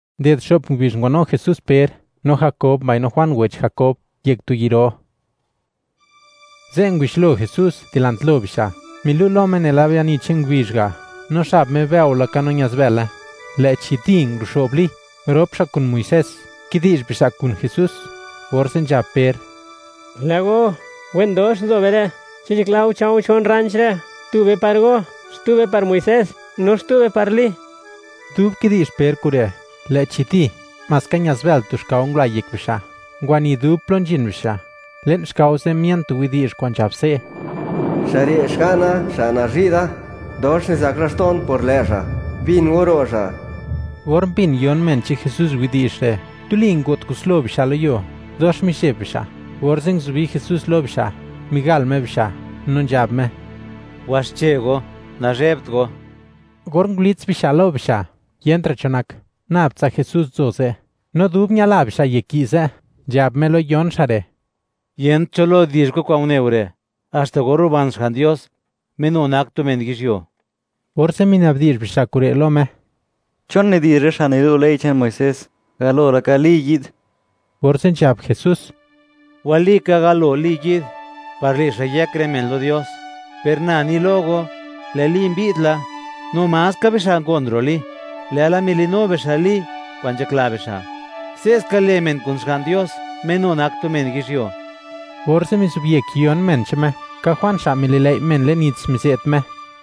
Unded xo'p ngubizh, ngwanu Jesús Per, no Jakob, mbaino Juan wech Jakob, yek tu yi' ro. Ze', ngubixlo Jesús dilant lo bixa': milu' lo Me nela biani che'n ngubizh ga', no xab Me bëo laka no ñaz bële. Lë'chi ¡di!, nguro'xo'b Li, rop xa' kun Muisés, kidi'zh bixa' kun Jesús. Orze' nzhab Per: ―¡Lë' go, wen dox nzo be re'! Chi nzhakla go, cha̱u̱ chon rranch re'; tube par go, xtube par Muisés, no xtube par Li. Dub kidi'zh Per kure', lë'chi ¡di!, maska ña'zbël tu xkao ngula yek bixa', ngwani dub plo nzhin bixa'; le'n xkao ze' mien tu widi'zh kwa'n nzhab se': ―¡Xa' re' Xga'na, Xa' nazhi' da!, dox nizak laxto'n por lë' Xa'; ¡bin go ro' Xa'! Or mbin yon men che'n Jesús widi'zh re', tuli ngo't kuslo bixa' lo yuo, dox mizheb bixa', orze' nguzubi Jesús lo bixa', migal Me bixa', no nzhab Me: ―Waxche go, nanzhebt go. Or ngulits bixa' lo bixa', yentra' cho nak, nab tsa Jesús nzo ze'. No dub ñadla bixa' yek yi' ze', nzhab Me lo yon xa' re': ―Yent cho lo di'zh go kwa'n une go re', haxta or ruban Xga'n Dios, Me nu nak tu men yizhyuo. Orze' minabdi'zh bixa' kure' lo Me: ―¿Chon nidi'zh rë xa' nilu' ley che'n Muisés, galo laka Li yi'd? Orze' nzhab Jesús: ―Walika, galo Li yi'd, par le' xa' yëk rë men lo Dios, per na ni lo go, lë' Li mbi'd la, no maska bixa' ngon ro' Li, lë'la mili'nu bixa' Li kwa'n nzhakla bixa'. Se'ska le' men kun Xga'n Dios, Me nu nak tu men yizhyuo. Orze' mizobyek yon men che'n Me, ka Juan xa' mililëi' men le'n nits, mize't Me.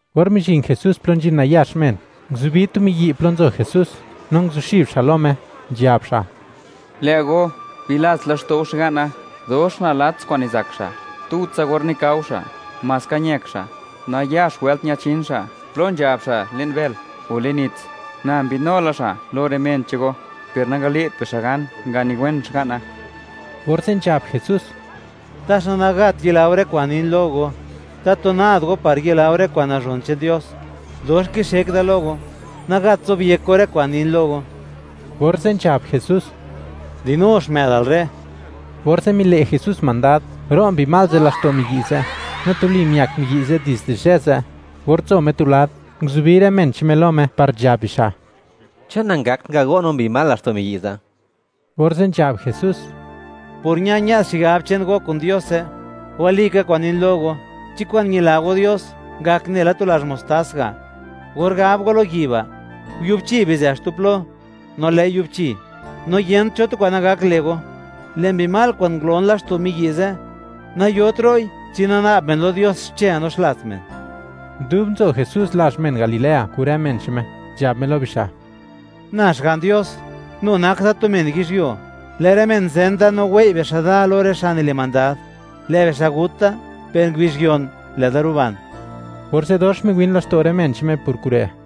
Or mizhin Jesús plo nzhin nayax men, nguzubi tu miyi' plo nzo Jesús, no nguzuxib xa' lo Me, nzhab xa': ―Lë' go, bilats laxto'u xga'na, dox nalats kwa'n nizak xa', tutsa or nikao xa' maska ñëk xa'; nayax wëlt ñachin xa' plo nzhab xa' le'n bël o le'n nits. Na mbi'dnu la xa' lo rë men che'n go, per nangale't bixa' gan, nganiwen xga'na. Orze' nzhab Jesús: ―¡Taxa nagat yila go rë kwa'n nin lo go! ¡Tatu nad go par yila go rë kwa'n nazhon che'n Dios! ¡Dox kixek da lo go, nagat zobyek go rë kwa'n nin lo go! Orze' nzhab Jesús: ―¡Dinu xmë'dal re'! Orze' mile' Jesús mandad, ro' mbi mal ze' laxto' miyi' ze'; no tuli miak miyi' dizde zhë ze'. Or nzo Me tu lad, nguzubi rë men che'n Me lo Me par nzhab bixa': ―¿Chon nangakt ngago' no mbi mal laxto' miyi' ze'? Orze' nzhab Jesús: ―Por ña-ñë'd xigab che'n go kun Diose. Walika kwa'n nin lo go, chi kwa'n ñila go Dios ngak nela tu lazh mostas ga', or gab go lo yi' ba': “Yubchi, bizë xtu plo”, no lë'i yubchi, no yent cho tu kwa'n nagak le' go. Lë' mbi mal kwa'n ngulon laxto' miyi' ze', nayot ro'i chi nana'b men lo Dios xche, no xlats men. Dub nzho Jesús lazh men Galilea kun rë men che'n Me, nzhab Me lo bixa': ―Na, Xga'n Dios, nu nak Da tu men yizhyuo, lë' rë men zen da no wei' bixa' da lo rë xa' nile' mandad. Lë' bixa' gut da, per ngubizh yon, lë'da ruban. Orze' dox miwin laxto' rë men che'n Me por kure'.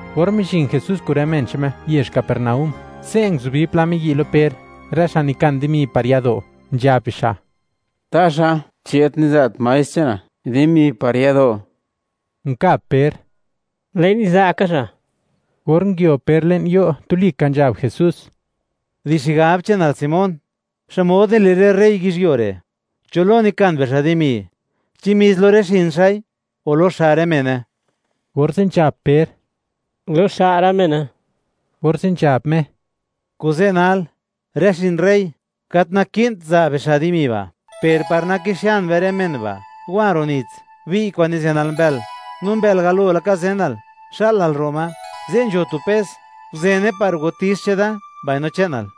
Or mizhin Jesús kun rë men che'n Me yezh Capernaúm, ze' nguzubi pla miyi' lo Per, rë xa' nikan dimi par yado', nzhab bixa': ―¿Taxa chi gat niza't Maestr che'nal dimi par yado'? Nkab Per: ―Lë'i niza' ka Xa'. Or nguio Per le'n yo', tuli ka nzhab Jesús: ―Di xigab che'nal Simón, ¿xmod nile' rë rey yizhyuo re'? ¿Cho lo nikan bixa' dimi? ¿Chi mis lo rë xin xa'i, o lo xa' rë mene? Orze' nzhab Per: ―Lo xa' rë mene. Orze' nzhab Me: ―Kuze' nal, rë xin rey, gat naki'nt za' bixa' dimi ba', per par naki'xian be rë men ba', wa ro' nits, bi'y kwa'n nizenal mbël; no mbël galo laka zenal, xa'lal ro' ma, ze' nzho tu pes, guzene par wati'x cheda mbaino che'nal.